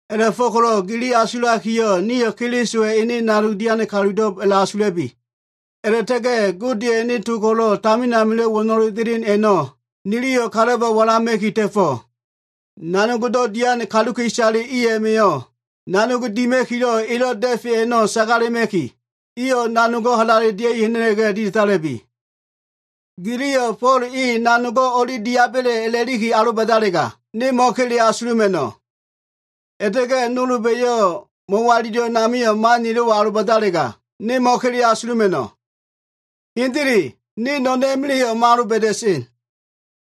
A꞉la꞉fo꞉ko꞉lo꞉ gili asulakiyo꞉, nio꞉ Kelisowa꞉ ene nanog dian kalulo꞉b a꞉la꞉asula꞉bi. A꞉la꞉ta꞉ga꞉ Godeya꞉ ene to ko꞉lo꞉ tamin amilo꞉ wo꞉no꞉lelo꞉ delen a꞉no꞉ niliyo꞉ kalaba walama꞉ki ta꞉fo꞉. Nanogdo꞉ dian kaluka꞉isale i a꞉ma꞉yo꞉, nanog dima꞉kilo꞉ ilo꞉ da꞉feyo꞉ a꞉no꞉ sagalema꞉ki, iyo꞉ nanogo꞉ halale dia꞉i ha꞉na꞉la꞉ga꞉ ditandala꞉bi. Giliyo꞉ “Fo꞉l e nanogo꞉ o꞉li diaba꞉le” a꞉la꞉liki aloba꞉dalega, ne mo꞉kele asuluma꞉no꞉. A꞉la꞉ta꞉ga꞉ nolba꞉yo꞉ mo꞉walilo꞉ amio꞉lo꞉ man nilo꞉wo꞉ aloba꞉dalega, ne mo꞉kele asuluma꞉no꞉. Hendele, ne no꞉no꞉n a꞉ma꞉la꞉yo꞉ mo꞉aloba꞉da꞉sen.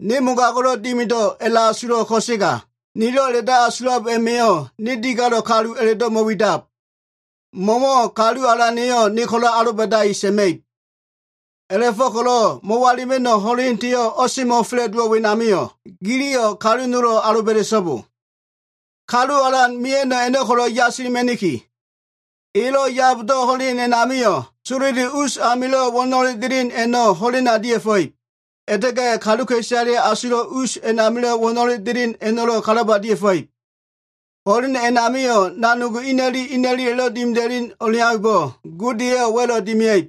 Ne mogago꞉lo꞉ mo꞉dimido꞉ a꞉la꞉asulo꞉, ko꞉sega nilo꞉ a꞉la꞉do꞉ asulab a꞉ma꞉yo꞉ ne digalo꞉ kalu a꞉la꞉bo꞉ mo꞉widab. Mo꞉wo꞉ kalu Alana꞉yo꞉ ne ko꞉lo꞉ aloba꞉daki sa꞉ma꞉ib. A꞉la꞉fo꞉ko꞉lo꞉ mo꞉walilima꞉no꞉ ho꞉lendeyo꞉ o꞉semo꞉fa꞉la꞉dowo꞉ wenamio꞉, giliyo꞉ kalu nolo꞉ aloba꞉da꞉so꞉bo. Kalu Alan mia꞉no꞉ a꞉no꞉ ko꞉lo꞉ yasilima꞉niki. Elo꞉ yabdo꞉ ho꞉len a꞉namio꞉, sololi us amilo꞉ wo꞉no꞉lelo꞉ delen a꞉no꞉ ho꞉lena dia꞉fa꞉ib. A꞉la꞉ta꞉ga꞉ kaluka꞉isaleya꞉ asulo꞉ usamilo꞉ wo꞉no꞉lelo꞉ delen a꞉no꞉lo꞉ kalaba dia꞉fa꞉ib. Ho꞉len a꞉namio꞉ nanogo꞉ ina꞉li ina꞉lilo꞉wa꞉lo꞉ dimida꞉len o꞉leaumbo꞉, Gode eyo꞉ wa꞉lo꞉ dimia꞉ib.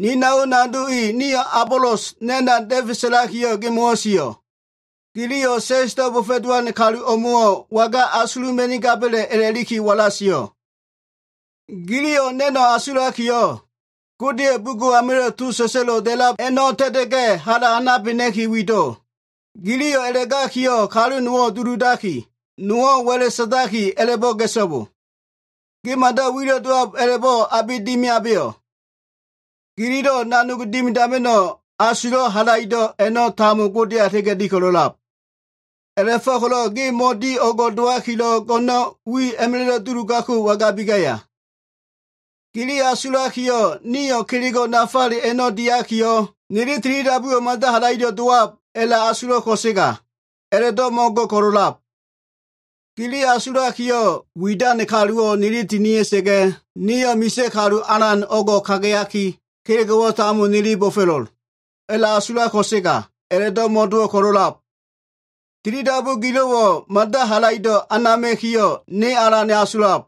Ni nao nado i, niyo꞉ Abolos na꞉na da꞉fe sa꞉lakiyo꞉, gimo꞉wo꞉ sio꞉. Giliyo꞉ sa꞉sdo꞉ bo꞉fo꞉lowan kalumo꞉wo꞉ waga asuluma꞉nigaba꞉le a꞉la꞉liki walama꞉ki sio꞉. Giliyo꞉ na꞉no꞉ asulakiyo꞉, Godeya꞉ bugo꞉ amilo꞉ to sa꞉sa꞉lo꞉ da꞉lab a꞉no꞉ ta꞉ta꞉ga꞉ hala ha꞉nabena꞉ki wido꞉l. Giliyo꞉ a꞉la꞉gakiyo꞉, kalu nowo꞉ duludaki, nowo꞉ wa꞉la꞉ sa꞉ndaki, a꞉la꞉bo꞉ ga꞉so꞉bo. Ge mada wilo꞉ dowab a꞉la꞉bo꞉ abe dimiabeyo꞉? Gililo꞉ nanog dimidama꞉no꞉ asulo꞉ halaido꞉ a꞉no꞉ tambo, Godeya a꞉la꞉ta꞉ga꞉ di ko꞉lo꞉lab. A꞉la꞉fo꞉ko꞉lo꞉ ge mo꞉di o꞉ngo꞉ dowakilo꞉, go꞉no꞉n a꞉ma꞉la꞉lo꞉ wi duludako꞉ wangabi gaya? Gili asulakiyo꞉, “Nio꞉ kelego꞉ nafale a꞉no꞉ diakiyo꞉, nili tilidabuwo꞉ mada halaido꞉ dowab,” a꞉la꞉asulo꞉ ko꞉sega a꞉la꞉do꞉ mo꞉go꞉ ko꞉lo꞉lab. Gili asulakiyo꞉, “Widan kaluwo꞉ niliyo꞉ tinia꞉sa꞉ga꞉, nio꞉ misa꞉ kalu alan o꞉ngo꞉ kagayaki, kelego꞉wo꞉ tambo nili bo꞉fo꞉lo꞉l,” a꞉la꞉asulab ko꞉sega, a꞉la꞉do꞉ mo꞉dowo꞉ ko꞉lo꞉lab. Tilidabu gililo꞉wo꞉ mada halaido꞉ anama꞉kiyo꞉, ne alan asulab.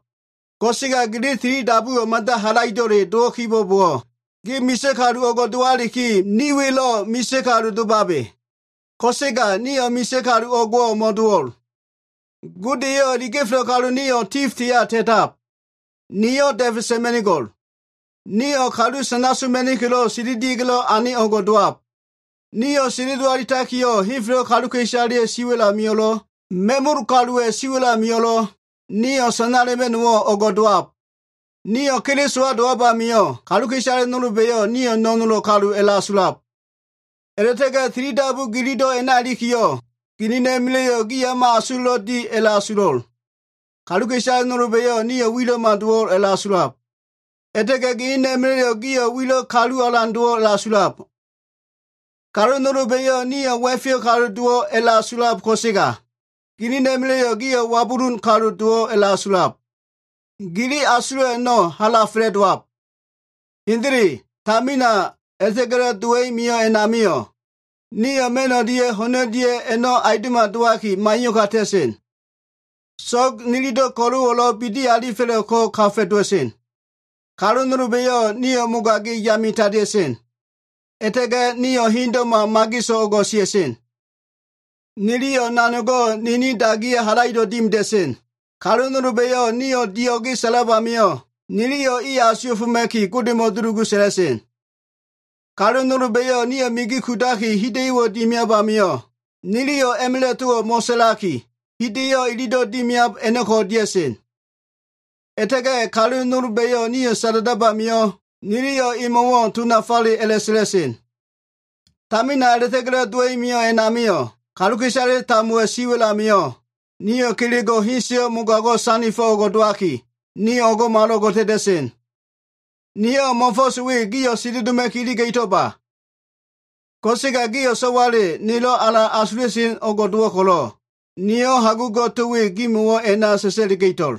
Ko꞉sega gili tilidabuwo꞉ mada halaido꞉le dowo꞉ kibo꞉bowo꞉, gio꞉ misa꞉ kalu o꞉ngo꞉ dowaliki, ni welo꞉ misa꞉ kalu domabe. Ko꞉sega nio꞉ misa꞉ kalu o꞉ngo꞉wo꞉ mo꞉dowo꞉l. Gode eyo꞉ iliga꞉felo꞉ kalu nio꞉ tifdeya ta꞉tab. Niyo꞉ da꞉fe sa꞉ma꞉nigo꞉l. Nio꞉ kalu sana soma꞉nikilo꞉ sendelia꞉ga꞉lo꞉ ane o꞉ngo꞉ dowab. Nio꞉ sendelo alitakiyo꞉, henfelo꞉ kaluka꞉isaleya꞉ siwa꞉l amio꞉lo꞉, ma꞉mul kaluwa꞉ siwa꞉l amio꞉lo꞉, nio꞉ sanala꞉ma꞉no꞉wo꞉ o꞉ngo꞉ dowab. Nio꞉ Kelisowa dowab amio꞉, kaluka꞉isale nolba꞉yo꞉ nio꞉ no꞉nolo꞉ kalu a꞉la꞉asulab. A꞉la꞉ta꞉ga꞉ tilidabu gililo꞉ a꞉na ilikiyo꞉, ginina꞉ma꞉la꞉yo꞉ gio꞉ o꞉ma asulo꞉lo꞉ di a꞉la꞉asulo꞉. Kaluka꞉isale nolba꞉yo꞉ nio꞉ wilo꞉ma dowo꞉ a꞉la꞉asulab. A꞉la꞉ta꞉ga꞉ ginina꞉ma꞉la꞉yo꞉ gio꞉ wilo꞉ kalu alan dowo꞉ a꞉la꞉asulab. Kalu nolba꞉yo꞉ nio꞉ wa꞉feyo꞉ kalu dowo꞉ a꞉la꞉asulab ko꞉sega, ginina꞉ma꞉la꞉yo꞉ gio꞉ wabulun kalu dowo꞉ a꞉la꞉asulab. Gili asulo꞉ a꞉no꞉ hala fa꞉la꞉dowab. Hendele, tamina a꞉la꞉ta꞉ga꞉lo꞉ dowa꞉i mio꞉ a꞉namio꞉ nio꞉ ma꞉n o꞉lia꞉ ho꞉n o꞉lia꞉yo꞉ aundo꞉ma dowaki, maiyo꞉ka ta꞉sen. So꞉g nililo꞉ ko꞉lo꞉wo꞉ bidi alifelo꞉ ko꞉ kagedela꞉sen. Kalu nolba꞉yo꞉ nio꞉ mogagi yame tandea꞉sen. A꞉la꞉ta꞉ga꞉ nio꞉ hendo꞉ma, mageso꞉ o꞉ngo꞉ sia꞉sen. Niliyo꞉ nanogo꞉ nini dagiya꞉ halaido꞉ dimida꞉sen. Kalu nolba꞉yo꞉ nio꞉ dio꞉ge sa꞉lab amio꞉, niliyo꞉ iyo꞉ asuwa꞉foma꞉ki, Godemo꞉ dulugu sa꞉la꞉sen. Kalu nolba꞉yo꞉ nio꞉ migi kudaki, hida꞉yo꞉wo꞉ dimiab amio꞉, niliyo꞉ a꞉ma꞉la꞉ towo꞉ mo꞉sa꞉laki, hida꞉yo꞉ ililo꞉ dimiab a꞉no꞉ko꞉ dia꞉sen. A꞉la꞉ta꞉ga꞉ kalu nolba꞉yo꞉ nio꞉ sada꞉dab amio꞉, niliyo꞉ imo꞉wo꞉ to nafale a꞉sa꞉la꞉sen. Tamina a꞉la꞉ta꞉ga꞉lo꞉ dowa꞉i mio꞉ a꞉namio꞉, kaluka꞉isale tambowa꞉ siwa꞉l amio꞉ nio꞉ kelego꞉ heseyo꞉ mogago꞉ sandifo꞉ o꞉ngo꞉ dowaki, nio꞉ o꞉ngo꞉malo꞉ngo꞉ ta꞉ta꞉sen. Niyo꞉ mo꞉fo꞉s we gio꞉ sendeloma꞉ki iliga꞉to꞉ba. Ko꞉sega gio꞉ so꞉wale, nelo꞉ alan asula꞉sen o꞉ngo꞉ dowo꞉ ko꞉lo꞉, niyo꞉ hagugo꞉ to we gimo꞉wo꞉ a꞉na sa꞉sa꞉liga꞉to꞉l.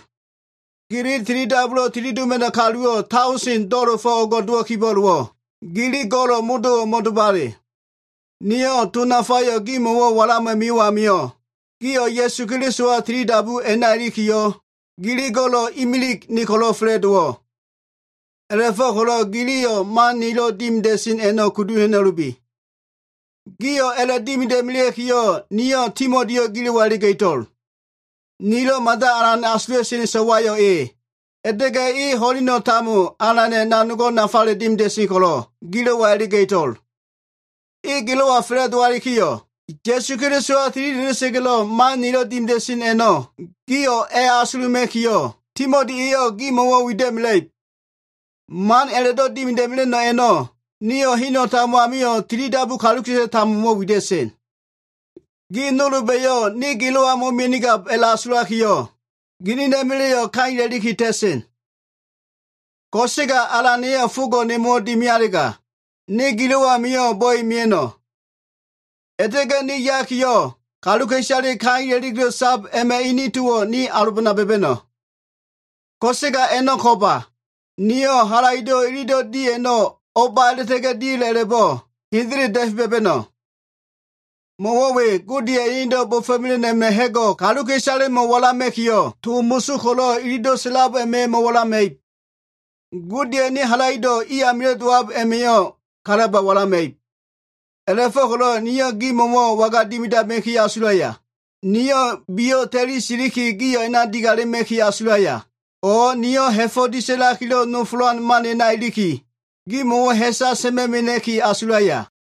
Gili tilidabulo꞉ tilidoma꞉no꞉ kaluwo꞉ daoseno꞉ do꞉la꞉fo꞉ o꞉ngo꞉ dowo꞉ kibo꞉bowo꞉, gili go꞉lo꞉ modo꞉wo꞉ mo꞉domabe. Niyo꞉ to nafayo꞉ gimo꞉wo꞉ walama꞉ mio꞉ amio꞉, gio꞉ Ya꞉su Kelisowa tilidabu a꞉na ilikiyo꞉, gili go꞉lo꞉ imilig ne ko꞉lo꞉ fa꞉la꞉dowo꞉. A꞉la꞉fo꞉ko꞉lo꞉ giliyo꞉ man nilo꞉ dimida꞉sen a꞉no꞉ kudu ha꞉na꞉lubi. Gio꞉ a꞉la꞉ dimida꞉melea꞉kiyo꞉, niyo꞉ Timotiyo꞉ gilo꞉wa iliga꞉to꞉l. Ni so꞉wa we niyo꞉ mada alan asula꞉sen. E ho꞉leno꞉ tambo Alana꞉ nanogo꞉ nafale dimida꞉sen ko꞉lo꞉, gilo꞉wa iliga꞉to꞉l. E gilo꞉wa fa꞉la꞉dowalikiyo꞉, Ya꞉su Kelisowa tilida꞉da꞉sa꞉ga꞉lo꞉ man nilo꞉ dimida꞉sen a꞉no꞉ gio꞉ a꞉asuluma꞉kiyo꞉, Timoti eyo꞉ gimo꞉wo꞉ wida꞉mela꞉ib. Man a꞉la꞉do꞉ dimida꞉mela꞉no꞉ a꞉no꞉ niyo꞉ heno꞉ tambo amio꞉ tilidabu kaluka꞉isale tambomo꞉wo꞉ wida꞉sen. Gi nolba꞉yo꞉ ne gilo꞉ amio꞉ mo꞉mia꞉nigab a꞉la꞉asulakiyo꞉, ginina꞉ma꞉la꞉yo꞉ kaila꞉liki ta꞉sen. Ko꞉sega Alana꞉yo꞉ fogo꞉ nemo꞉wo꞉ dimialega, ne gilo꞉ amio꞉ bo꞉e mia꞉no꞉. A꞉la꞉ta꞉ga꞉ ne ya꞉ga꞉yo꞉, kaluka꞉isale kaila꞉likilo꞉ sab a꞉ma꞉ ini towo꞉ ne alobana ba꞉ba꞉no꞉. Ko꞉sega a꞉no꞉ ko꞉mba. Niyo꞉ halaido꞉ ililo꞉ di a꞉no꞉ o꞉ba a꞉la꞉ta꞉ga꞉ dia꞉le a꞉la꞉bo꞉ hendele da꞉fe ba꞉ba꞉no꞉. Mo꞉wo꞉ we, Godeya꞉ enedo꞉ bo꞉fo꞉mela꞉no꞉ a꞉ma꞉ ha꞉go꞉ kaluka꞉isalemo꞉ walama꞉kiyo꞉, to moso ko꞉lo꞉ ililo꞉ sa꞉lab a꞉ma꞉yo꞉ mo꞉walama꞉ib. Godeya꞉ ene halaido꞉ i amilo꞉ dowab a꞉ma꞉yo꞉ kalaba walama꞉ib. A꞉la꞉fo꞉ko꞉lo꞉ niyo꞉ gimo꞉wo꞉ waga dimidama꞉ki asulaya? Niyo꞉ biyo꞉ ta꞉li siliki, gio꞉ a꞉na digalema꞉ki asulaya? O꞉ niyo꞉ ha꞉fo꞉ disa꞉lakilo꞉ nofolan man a꞉na iliki, gimo꞉wo꞉ ha꞉sa sa꞉ma꞉ mena꞉ki asulaya?